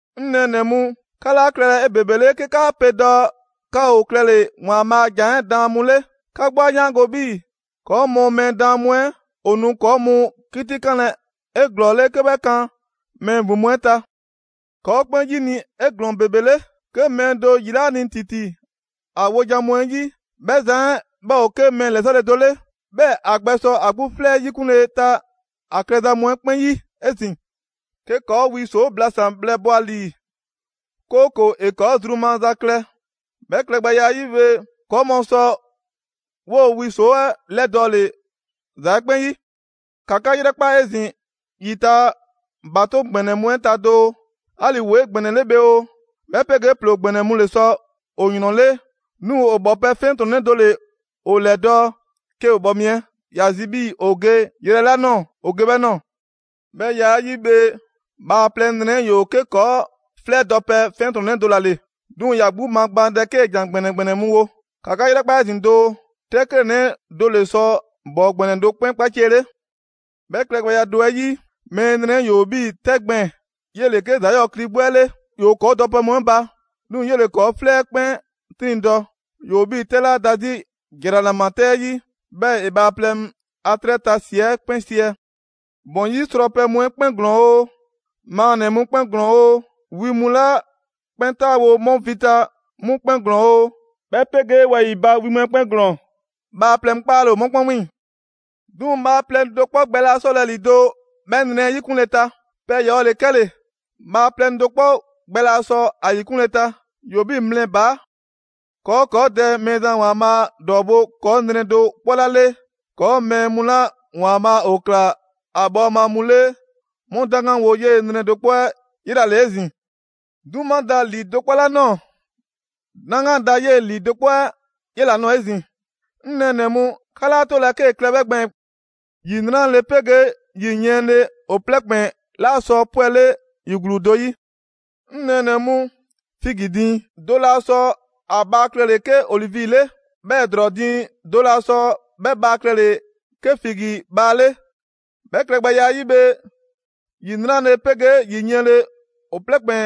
'Ŋ nɛɛnɛ‑ mu, 'ka 'laa klɛlɛ 'ebebele 'ke 'kaa pe dɔɔ 'ka ‑o klɛle‑ ‑Waanbhaa' a ‑Jan 'ɛ daan mu 'le. 'Ka 'gbu 'a 'yaango‑ 'bhii‑ ‑kɔɔ' mu mɛɛ daan mu 'ɛ, ‑o nu ‑kɔɔ' mu 'kitikanlɛ 'eglɔɔle 'ke 'bhɛ kan mɛɛ ‑vin mu 'ɛ ta. ‑Kɔɔ' 'kpɛn 'yini‑ 'e ‑glɔɔn ‑bebe 'le. 'Ke mɛɛ do ‑yi 'laa ni ‑titi ‑a 'wojan‑ mu 'ɛ 'yi, 'bhɛ zan 'ɛ 'bhɛ ‑o 'ke mɛɛ ‑lɛsɔle do 'le. 'Bhɛɛ‑ ‑a gbɛsɔ ‑a 'gbu 'flɛ 'ɛ 'yikunle ta ‑a klɛza mu 'ɛ 'kpɛn 'yi 'ezin‑. 'Ke ‑kɔɔ' wi ‑soo' blasan‑ bhlɛ bɔ‑a ‑lii, 'kooko‑ ‑e 'kɔɔ‑ zru maza klɛ. 'Bhɛ klɛgbɛya 'ɛ 'yi bhe, ‑kɔɔ' mu sɔ 'woo‑ wi ‑soo' 'ɛ 'lɛdɔɔle ‑za 'ɛ 'kpɛn 'yi. ‑Ka 'ka 'yrɛkpa 'ezin‑ ‑yi ta ‑batoŋ' ‑gbɛnɛ mu 'ɛ ta doo: 'ali‑ ‑woo 'egbɛnɛle bhe oo, 'bhɛ 'pegee ‑ploo ‑gbɛnɛ mu ‑le sɔ ‑o ‑yrɔnle', 'duŋ‑ ‑o bhɔpɛ 'fiɛntrɔnnɛ do ‑le ‑o ‑lɛdɔɔ' 'ke ‑o bhɔ mi 'ɛ ‑ya zi 'bhii‑ ‑o ge yrɛ 'la ꞊nɔɔ ‑o ge 'bhɛɛ‑ ꞊nɔɔ. 'Bhɛ ya 'ɛ 'yi bhe, bhaaplɛŋ nrɛ 'ɛ ‑yoo 'ke ‑kɔɔ' 'flɛ 'ɛ dɔpɛ 'fiɛntrɔnnɛ do ‑la ‑le. 'Duŋ‑ ‑ya 'gbu magbaandɛ 'kee‑ ‑jan ‑gbɛnɛ ‑gbɛnɛ mu wo. ‑Ka 'ka 'yrɛkpa 'ezin‑ doo, 'tɛ 'klɛɛnnɛ do ‑le sɔ ‑bɔɔ ‑gbɛnɛ do 'kpɛn 'kpaciɛle. 'Bhɛ klɛgbɛya do 'ɛ 'yi, mɛɛ nrɛ 'ɛ ‑yoo 'bhii‑ 'tɛ gbɛɛn‑. 'Yele‑ 'ke ‑za 'yɔɔ‑ kli 'gbu 'ɛ 'le. ‑Yoo ‑kɔɔ' dɔpɛ mu 'ɛ ba, 'duŋ‑ 'yele‑ ‑kɔɔ' 'flɛ 'ɛ 'kpɛn 'triŋdɔ‑. ‑Yoo 'bhii‑ 'tɛ 'la da 'zi ‑jranama 'tɛ 'yi, 'bhɛɛ‑ ‑e bhaaplɛŋ a 'trɛ ta ‑si 'ɛ 'kpɛn 'siɛ‑. ‑Bɔn 'yi srɔpɛ mu 'ɛ 'kpɛn ‑glɔɔn ‑o, maannɛ‑ mu 'kpɛn ‑glɔɔn ‑o, wi mu 'la 'kpɛn 'taawo‑ 'mu vi ta 'mu 'kpɛn ‑glɔɔn ‑o, 'bhɛ 'pegee wɛyi‑ ba wi mu 'ɛ 'kpɛn ‑glɔɔn, bhaaplɛŋ 'kpaale‑ ‑o 'mu 'kpɛn 'wiiŋ‑. 'Duŋ‑ bhaaplɛŋ do 'kpɔ gbɛ laa 'sɔlɛ‑ ‑lido' mɛɛ nrɛ 'ɛ 'yikunle ta. Pɛ ‑yɔɔ' ‑le 'kɛle‑, bhaaplɛŋ do 'kpɔ gbɛ laa sɔ ‑a ‑yikunle ta. ‑Yoo 'bhii‑ mlɛ ‑baa'. ‑Kɔɔ' 'kɔɔ Dɛ Mɛɛzan ‑Waanbhaa' ‑dɔɔbo' ‑kɔɔ' nrɛ do 'kpɔ 'la 'le, ‑kɔɔ' mɛɛ mu 'la ‑Waanbhaa' ‑o ꞊kla ‑a bhɔɔma mu 'le 'mu 'daŋganwo 'yee‑ nrɛ do 'kpɔ 'ɛ 'yela‑ ‑le 'ezin‑. 'Duma da ‑lii do 'kpɔ 'la ꞊nɔɔ, 'daŋgan da 'yee‑ ‑lii do kpɔ 'ɛ 'yela‑ nɔɔ‑ 'ezin‑. 'Ŋ nɛɛnɛ‑ mu, 'ka 'laa 'tolɛ‑ 'kee‑ klɛ 'bhɛ gbɛɛn‑. ‑Yi 'nrale‑ 'pegee ‑yi yiɛnle, ‑o plɛ ‑kpɛn 'laa sɔ 'pwɛle ‑yi ‑gluu do 'yi. 'Ŋ nɛɛnɛ‑ mu, figi diiŋ do laa sɔ ‑a bhaa klɛle‑ 'ke olivi 'le, 'bhɛɛ‑ ‑drɔɔ diiŋ do laa sɔ 'bhɛ bhaa klɛle‑ 'ke figi bhaa 'le. 'Bhɛ klɛgbɛya 'ɛ 'yi bhe, ‑yi 'nrale‑ 'pegee ‑yi yiɛnle, ‑o plɛ ‑kpɛn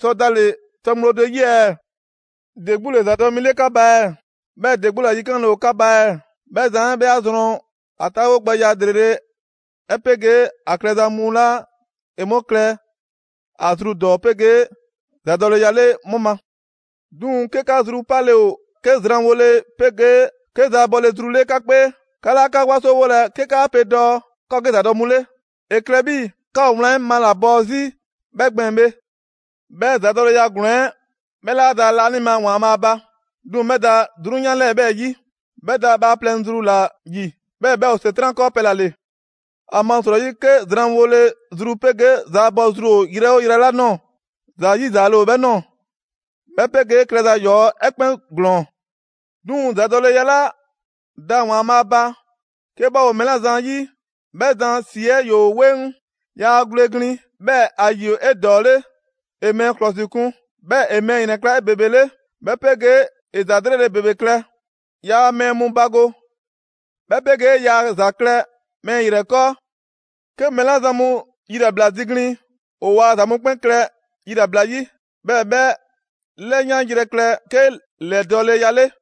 sɔ dale‑ tɔ ŋgblo do 'yi ɛɛ? ‑De 'gbu ‑le ‑zadɔ' mi 'le 'ka ba ɛɛ? 'Bhɛɛ‑ ‑de 'gbu ‑la yikanle ‑o 'ka ba ɛɛ? 'Bhɛ zan 'ɛ 'bhɛ 'a zrɔn a 'taawogbɛya ‑lrele' 'ɛ 'pegee ‑a klɛza mu 'la ‑e 'mu klɛ ‑a zru ‑dɔɔ 'pegee ‑zadɔleya 'le 'mu ma. 'Duŋ‑ 'ke 'ka zru 'pale‑ ‑o 'ke zranwole 'pegee 'ke zaabɔle zru 'le 'ka 'kpee, 'ka 'laa 'ka 'wasowolɛ 'ke 'kaa pe dɔɔ 'ka ‑o 'ke ‑zadɔ' mu ‑le. ‑E klɛ 'bhii‑ 'ka ‑o wlan 'ɛ malabɔɔ 'zi 'bhɛ gbɛɛn‑ bhe. 'Bhɛ ‑zadɔleya ‑glɔɔn 'ɛ 'bhɛ 'laa da laanima ‑Waanbhaa' ba. 'Duŋ‑ 'bhɛ da 'drunyan 'lɛɛ‑ 'bhɛɛ‑ 'yi, 'bhɛ da bhaaplɛŋ zru ‑la ‑yi, 'bhɛɛ‑ 'bhɛ ‑o ‑Setran' 'kɔɔpɛ‑ ‑la ‑le. ‑Amasrɔyi 'ke zranwole zru 'pegee zaabɔ zru ‑o yrɛ 'oo yrɛ 'la ꞊nɔɔ, ‑za 'yizaale ‑o 'bhɛɛ‑ ꞊nɔɔ, 'bhɛ 'pegee klɛza ‑yɔɔ' 'ɛ 'kpɛn ‑glɔɔn 'Duŋ‑ ‑zadɔleya 'la da ‑Waanbhaa' ba, 'ke 'bhɛ ‑o mɛɛ 'la zan 'yi, 'bhɛ zan ‑si 'ɛ ‑yoo 'weŋ, yaa gwle glin, 'bhɛɛ‑ ‑a ‑yi ‑o 'edɔɔle, ‑e mɛɛ ‑klɔsikun, 'bhɛɛ‑ ‑e mɛɛ ‑yrɛnkla' 'ebebele, 'bhɛ 'pegee ‑e ‑za 'lrele‑ ‑bebe klɛ. Yaa mɛɛ mu bago, 'bhɛ 'pegee yaa ‑za klɛ mɛɛ ‑yrɛ 'kɔɔ. 'Ke mɛɛ 'la zan mu yilabla ziglin, ‑o ‑waa ‑za mu 'kpɛn klɛ yilabla 'yi. 'Bhɛɛ‑ 'bhɛ 'lɛyanyrɛ klɛ 'ke ‑lɛdɔɔleya 'le.